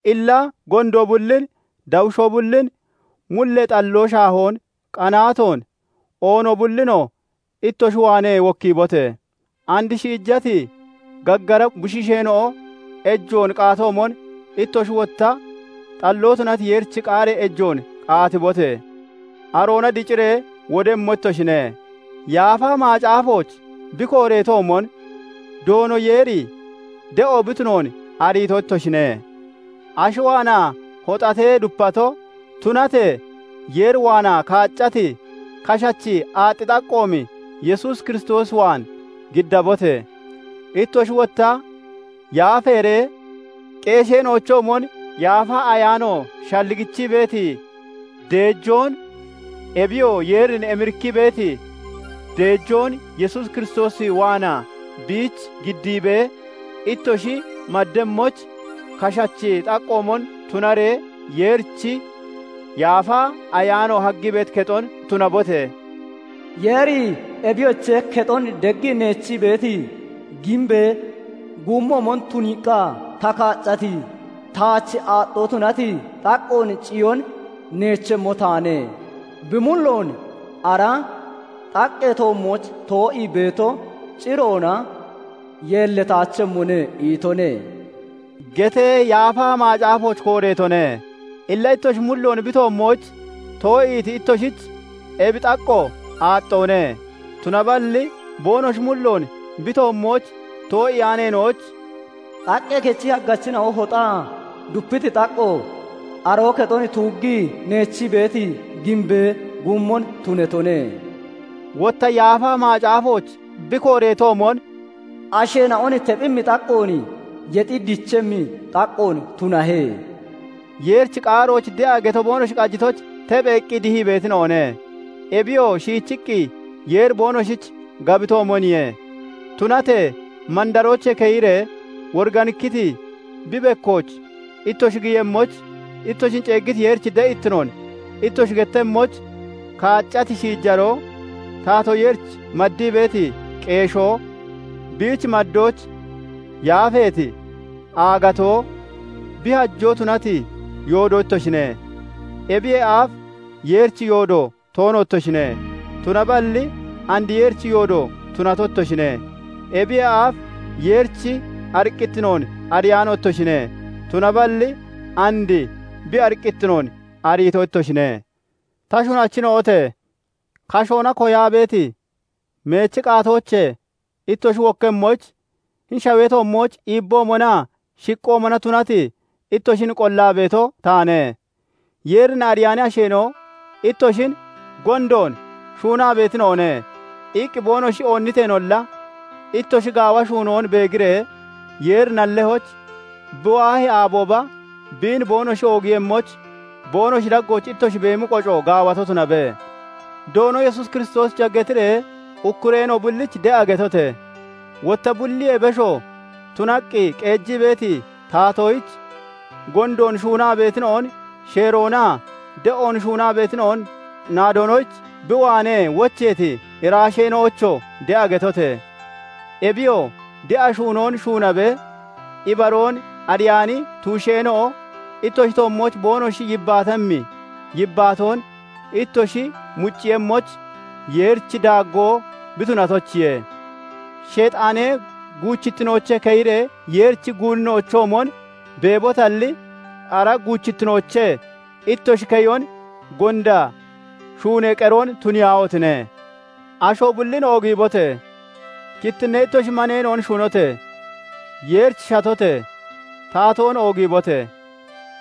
Illa gondo bullin, dawushoo bullin, mullee xalloo shaahoon, qanaatoon, oono bullinoo ittoshi waanee wokkiibote! And shiijati gaggara bushiisheena'o ejoon qaatoomon, ittoshi wotta xalloo tunati Yeerichi qaaree ejoon qaatibote! Aroona diciree wodemmo ittoshine. Yaafa Macaafooch bi kooreetoomon, "Doono Yeeri de'o bi tunoon ariito ittoshine." Ashi waanaa hoxatee dupato, tunatee Yeer waanaa kaaccati kashachi aaxxi xaqqoomi Yesuus Kiristoos waan giddabote! Ittoshi wotta yaafeeree qeesheena'ochoomon Yaafa Ayaano shalligichii beeti deejoon, ebiyoo Yeerin emirikkii beeti deejoon Yesuus Kiristoos waanaa biich giddiibee ittoshi maddemmoyich, kashachi xaqqoomon tunaree Yeerichi Yaafa Ayaano haggii beeti kexon tunabote! "Yeeri 'Ebiyoche! Kexon deggii neechii beeti giimbee guummoomon tuniiqqa ta kaaccati, Taach aaxxoo tunati xaqqoon Ciyoon neechemmo taane; Bi mulloon ara xaqqee toommooch too'ii beeto ciroona yeellataachemmone' itone" getee Yaafa Macaafooch kooreetone. Illa ittoshi mulloon bi toommooch too'iiti ittoshich ebi xaqqo aaxxoone; tunaballi boonoshi mulloon bi toommooch too'iyaaneena'oyich "Xaqqee kechi haggachina'o hoxaa dupiti xaqqo, Aroo kexon tuuggii neechii beeti giimbee guummon tunatone." Wotta Yaafa Macaafooch bi kooreetoomon, "Asheena'on tephemmi xaqqoon, Yexi dichemmi xaqqoon tunahe." Yeerichi qaaroyich de'a geto boonoshi qajitoyich, tepheeqqi dihii beetina'one; ebiyoo shiichiqqi Yeeri boonoshich gabitoomoniye. Tunatee mandaroochee keyiree woriganikkiti bi bekkooch ittoshi giyemmoyich, ittoshin ceeggiti Yeerichi de'ittinoon ittoshi gettemmoyich, kaaccati shiijaroo, Taatoo Yeerich maddii beeti qeeshoo, biich maddoyich yaafeeti aagatoo, bi hajoo tunati yoodo ittoshine; ebiyee aaf Yeerichi yoodo toono ittoshine; tunaballi and Yeerichi yoodo tunato ittoshine; ebiyee aaf Yeerichi ariqqittinoon ariyaano ittoshine; tunaballi and bi ariqqittinoon ariito ittoshine. Ta shunachina'ote! Kashoona koyaa beeti meechi qaatoochee ittoshi wokkemmoyich, hini shawee toommooch iibboomonaa shiqqoomona tunati ittoshin qollaa beeto taane; Yeerin ariyaani asheena'o ittoshin "Gondoon shuunaa beetina'one" iqqi boonoshi oonniteenolla, ittoshi gaawa shuunoon beegiree, Yeeri nalloyich bi waahi aabooba biin boonoshi oogiiyemmoyich, boonoshi daggooch ittoshi beemi qoco gaawato tunabe. Doono Yesuus Kiristoosicha getiree ukkureena'o bullich de'a getote! Wotta bulliyee besho tunaqqi qeejii beeti taatoyich, gondoon shuunaa beetina'on sheeroonaa de'oon shuunaa beetina'on naadonoyich bi waanee wocheeti iraasheena'oyichoo de'a getote! Ebiyoo de'a shuunoon shuunabee, ibaroon ariyaani tuusheena'o ittoshi toommooch boonoshi yibbaatemmi yibbaatoon ittoshi mucciiyemmoyich, Yeerichi daaggoo bi tunatoyichiye. Sheexaanee guuchittinoochee keyiree Yeerichi guunina'ochoomon beebotalli, ara guuchittinoochee ittoshi keyon gonda shuunee qeroon tuniyaahotine! Asho bullin oogiibote! Kittinnee ittoshi maneena'on shunote! Yeerich shatote! Taatoon oogiibote!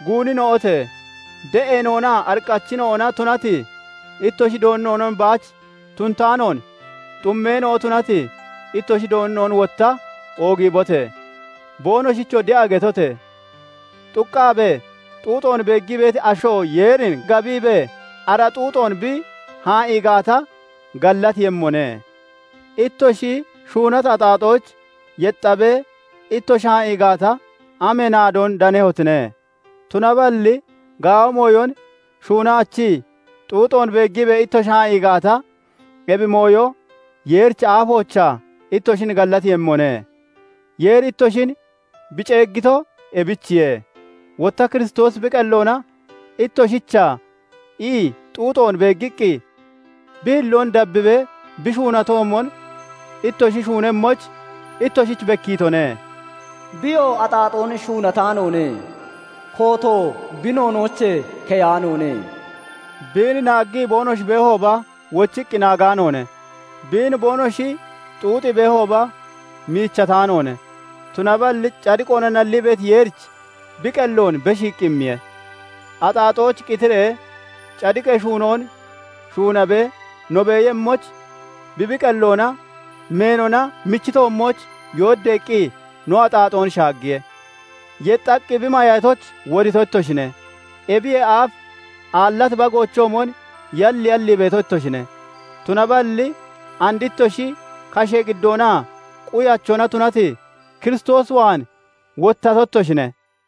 Guunina'ote! De'eena'onaa ariqqachina'ona tunati ittoshi doonina'on baach tunataanoon, xummeena'o tunati ittoshi doonina'onoo wotta oogiibote! Boonoshichoo de'a getote! Xuqqaabee xuuxoon beeggii beeti asho Yeerin gabiibee ara xuuxoon bi haa'ii gaata, gallateeyemmone. Ittoshi shuunati axaaxoyich yexxaabee ittoshi haa'ii gaata, amee naadoon danehotine? Tunaballi gaawa mooyon shuunaachii xuuxoon beeggiibee ittoshi haa'i gaata, ebi mooyo Yeerichi aafoochaa ittoshin gallatiiyemmone; Yeeri ittoshin bi ceeggito ebichiye. Wotta Kiristoosi bi qelloona ittoshicha ii xuuxoon beeggiqqi, bi hilloon dabbibee, bi shuunatoomon ittoshi shuunemmoyich ittoshich bekkiitone. Biyoo axaaxoon shuunataanoone; kooto bi noonoochee keyaanoone; biin naaggii boonoshi beehooba, wochiqqi naagaanoone; biin boonoshi xuuxii beehooba, miichataanoone; tunaballi cadiqoona nallii beeti Yeerich bi qelloon beshiiqqi immiye. Axaaxoyich qitiree cadiqee shuunoon shuunabee no beeyemmoyich, bi bi qelloona meenona michi toommooch yooddaqqi no axaaxoon shaaggiye; yexxaqqi bi mayatoyich, wodito ittoshine. Ebiyee aaf aallati bagoochoomon yalyallii beeto ittoshine; tunaballi and ittoshi kashee qiddoonaa quyachona tunati Kiristoos waan wottato ittoshine.